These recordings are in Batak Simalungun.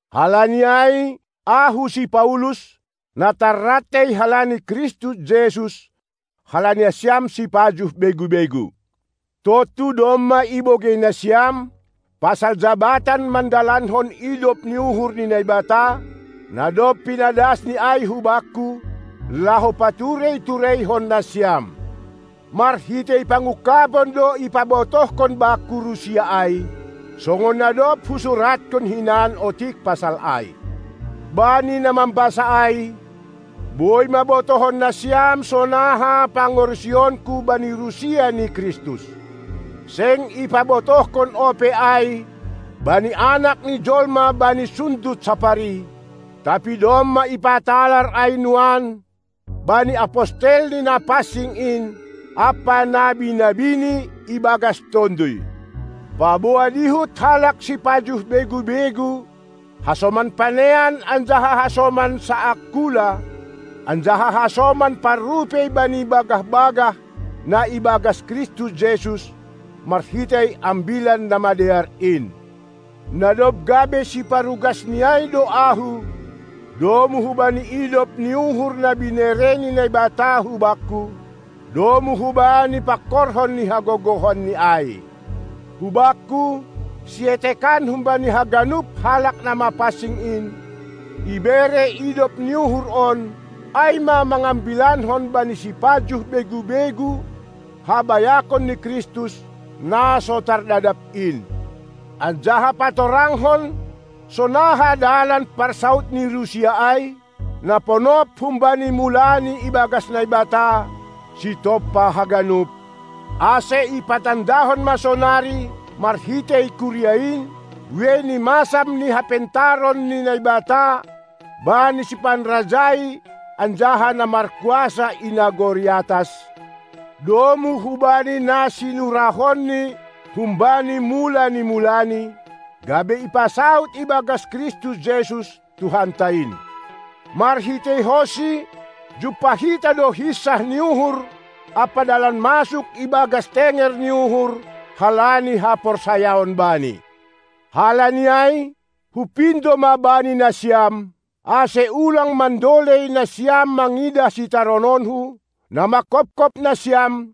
Halani ai, ahu si Paulus, na tarrantei halani Kristus Jesus, halani nasiam sipajuh begu-begu. Tontu domma ibogei nasiam pasal jabatan mandalankon idop ni uhur ni Naibata, na dob pinadasni ai hubakku, laho paturei-tureihon nasiam. Marhitei pangungkabon do ipabotohkon bakku rusia ai, songon na dob husuratkon hinan otik pasal ai. Bani na mambasa ai, boi ma botohon nasiam sonaha pangarusionku bani rusia ni Kristus. Seng ipabotohkon ope ai bani anak ni jolma bani sundut sapari, tapi domma ipatalar ai nuan bani apostelNi na pansing in ampa nabi-nabiNi, ibagas Tonduy, paboa dihut halak sipajuh begu-begu hasoman panean anjaha hasoman saangkula anjaha hasoman parrupei bani bagah-bagah na ibagas Kristus Jesus, marhitei Ambilan Namadear in. Na dob gabe siparugas ni ai do ahu, domu hubani idop ni uhur na binere ni Naibata hubakku, domu hubani pangkorhon ni hagogohon ni ai. Hubakku, sietekan humbani haganup halak na mapansing in, ibere idop ni uhur on, ai ma mangambilankon bani sipajuh begu-begu habayakon ni Kristus, na so tardadap in, anjaha patorangkon sonaha dalan parsaud ni rusia ai, na ponop humbani mulani ibagas Naibata, Sitompa haganup, ase ipatandahon ma sonari, marhitei kuria in, buei ni masam ni hapentaron ni Naibata bani sipanrajai anjaha na markuasa i nagori atas, domu hubani na sinurahon-Ni humbani mula ni mulani, gabe ipasaud ibagas Kristus Jesus, Tuhanta in. MarhiteihonSi jumpah hita do hinsah ni uhur ampa dalan masuk ibagas tenger ni uhur halani haporsayaon Bani. Halani ai, hupindo ma bani nasiam, ase ulang mandolei nasiam mangidah sitarononku, na manghopkop nasiam,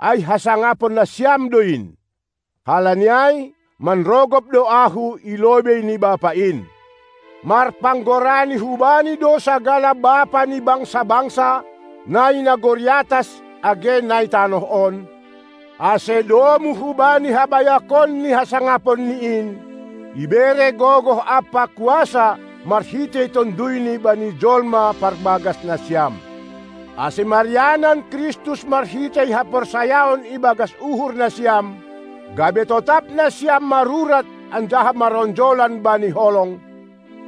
ai hasangapon nasiam do in. Halani ai, manrogop do ahu i lobei ni Bapa in. Marpanggorani hu-Bani do sagala bapa ni bangsa-bangsa, na i nagori atas age nai tanoh on, ase, domu hubani habayakon ni hasangaponNi in, ibere gogoh ampa kuasa marhitei TonduyNi bani jolma parbagas nasiam, ase marianan Kristus marhitei haporsayaon ibagas uhur nasiam, gabe totap nasiam marurat anjaha maronjolan bani holong,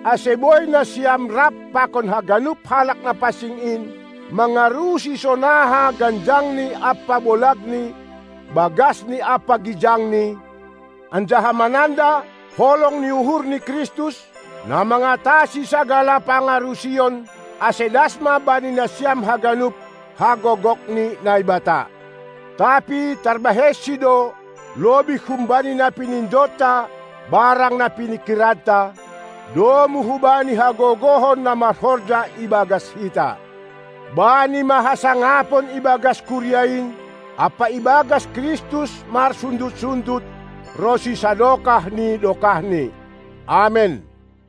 ase boi nasiam rap pakon haganup halak na pansing in mangarusi sonaha ganjangni ampa bolagni, bagasni ampa gijangni, anjaha mananda holong ni uhur ni Kristus, na mangatasi sagala pangarusion, ase das ma bani nasiam haganup hagogok ni Naibata. Tapi tarbahen-Si do lobih humbani na pinindonta barang na piningkiranta, domu hubani hagogohon na marhorja ibagas hita. Bani ma hasangapon ibagas kuria in ampa ibagas Kristus marsundut-sundut ronsi sadokah ni dokahni Amen.